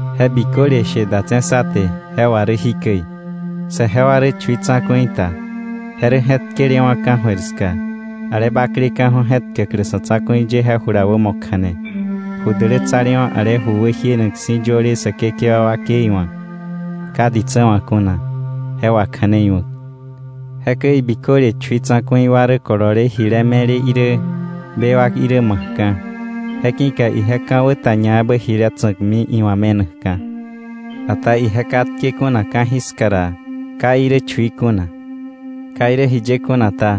Je biköle she datse̱ sá te je wà rä jikäi: saje wa rä chui tsa̱ku̱i ta, je rä je̱tkelewa̱ ka̱jöir ska ale bakleka̱ju̱ je je̱tkäklä sa̱ tsa̱ku̱i ye jula wämo kja̱ne, ju dälätsalewa̱ ale ju wäjienak si̱ yöle Säkekewa wakei wa̱, ka ditsä wa̱ kuna, je wakja̱neiwa̱k. Jekäi biköle chui tsa̱ku̱i wa rä kolole jile me̱le irä, bewak irä ma̱kka̱. Je ki̱ka ije ka̱wä ta ñaebä jile tsa̱kmi iwa̱ me̱nakka̱. Ata ije katke kuna ka̱jiska ra ka irä chui kuna. Ka irä jiye kuna ta,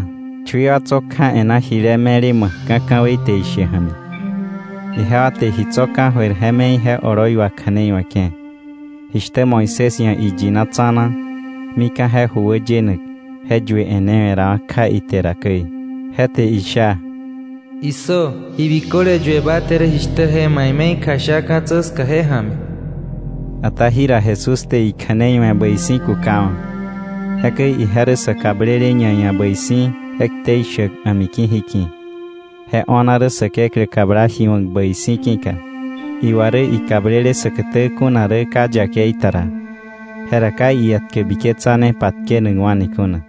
chui wa tso̱ kja e̱ná jile me̱le ma̱kka̱ ka̱wei te ishe ja̱mi. Ijewa te ji tso̱ ka̱jöir je me̱i je oloi wakja̱neiwe̱ke̱, jishtä Moisés ia̱ iyina tsa̱na, mika̱ je ju wäyenak je yue e̱newe̱rawa̱ kja ite ra käi. Je te isha: Issö, ji biköle yue ba te rä jishtä je̱ ma ia̱ ime̱i kjasha ka̱tsä ska je ja̱mi. Ata jira Jesús te ikja̱nei we̱ bäi si̱ kukawa̱. Jekäi ije rä sä kablele ñaia̱ bäi si̱ je ktei shäk a̱miki̱ jiki̱, je o̱na rä Säkeklä kabla ji wa̱k bäi si̱ ki̱ka. Iwa rä ikablele säkätä kuna rä ka yakei ta ra, jera ka ietkä biketsane patkenakwa̱ni kuna.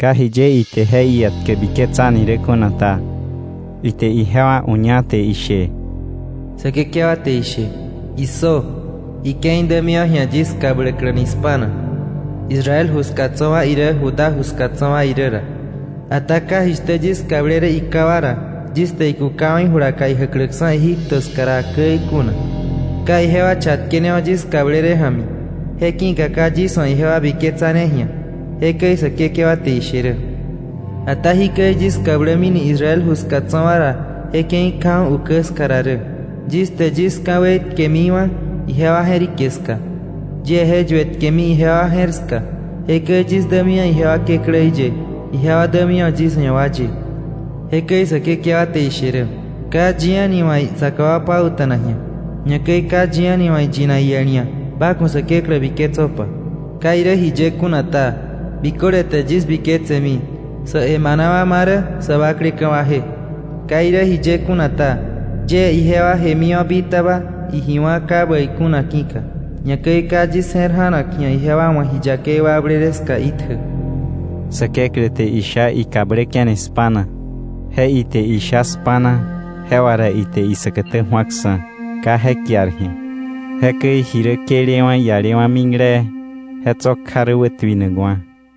Ka jiye ite je ietkä biketsani rä kuna ta, ite ijewa uña te ishe: “Säkekewa te ishe: ‘Issö. Ike̱i dämiwa̱ ji̱a yis kabläkläni spa̱na, Israel ju ska tso̱ wa irä Judá ju ska tso̱ wa irä ra, ata ka jishtä yis kablele iká wa ra, yis te ikukawa̱ ijulaka ijäkläksa̱ Egipto ska ra käi kuna. Ka ijewa chatkenewa̱ yis kablele ja̱mi, je ki̱ka ka yis wa̱ ijewa biketsane ji̱a.’ Jekäi Säkekewa te ishe rä. ‘Ata jikäi yis kablämini Israel ju ska tso̱ wa ra je ke̱i kjaju̱ ukä ska ra rä: Yis te yis ka̱wei tkemiwa̱ ijewa je̱rike ska, yie je yuetkemi ijewa je̱r ska. Jekäi yis dämiwa̱ ijewa Kekläí ye, ijewa dämiwa̱ yis ia̱ wa ye.’ Jekäi Säkekewa te ishe rä. ‘Ka yi a̱ni wa̱ isaka wa pauta̱nak ji̱a, ñakäi ka yi a̱ni wa̱ iyinak iel ia̱: “Ba ku̱ Säkekewa biketsöpa.” Ka irä jiye kuna ta, biköle te yis biketsemi, sa̱ emana wa marä sä bakleka̱ waje. Ka irä jiye kuna ta, yie ijewa jemiwa̱ bitaba iji wá̱ ka bäi kuna ki̱ka, ñakäi ka yis je̱r ja̱nak ji̱a ijewa wa̱ ji yakei wakblele ska itjä.’” Säkeklä te isha ikabläke̱ni spa̱na. Je ite isha “spa̱na,” je wà ra ite isäkätä ju̱aksa̱ ka je kiar ji̱a. Jekäi ji rä këlewa̱ ialewa̱ miklee, je tso̱ kja rä wätuinakwa̱.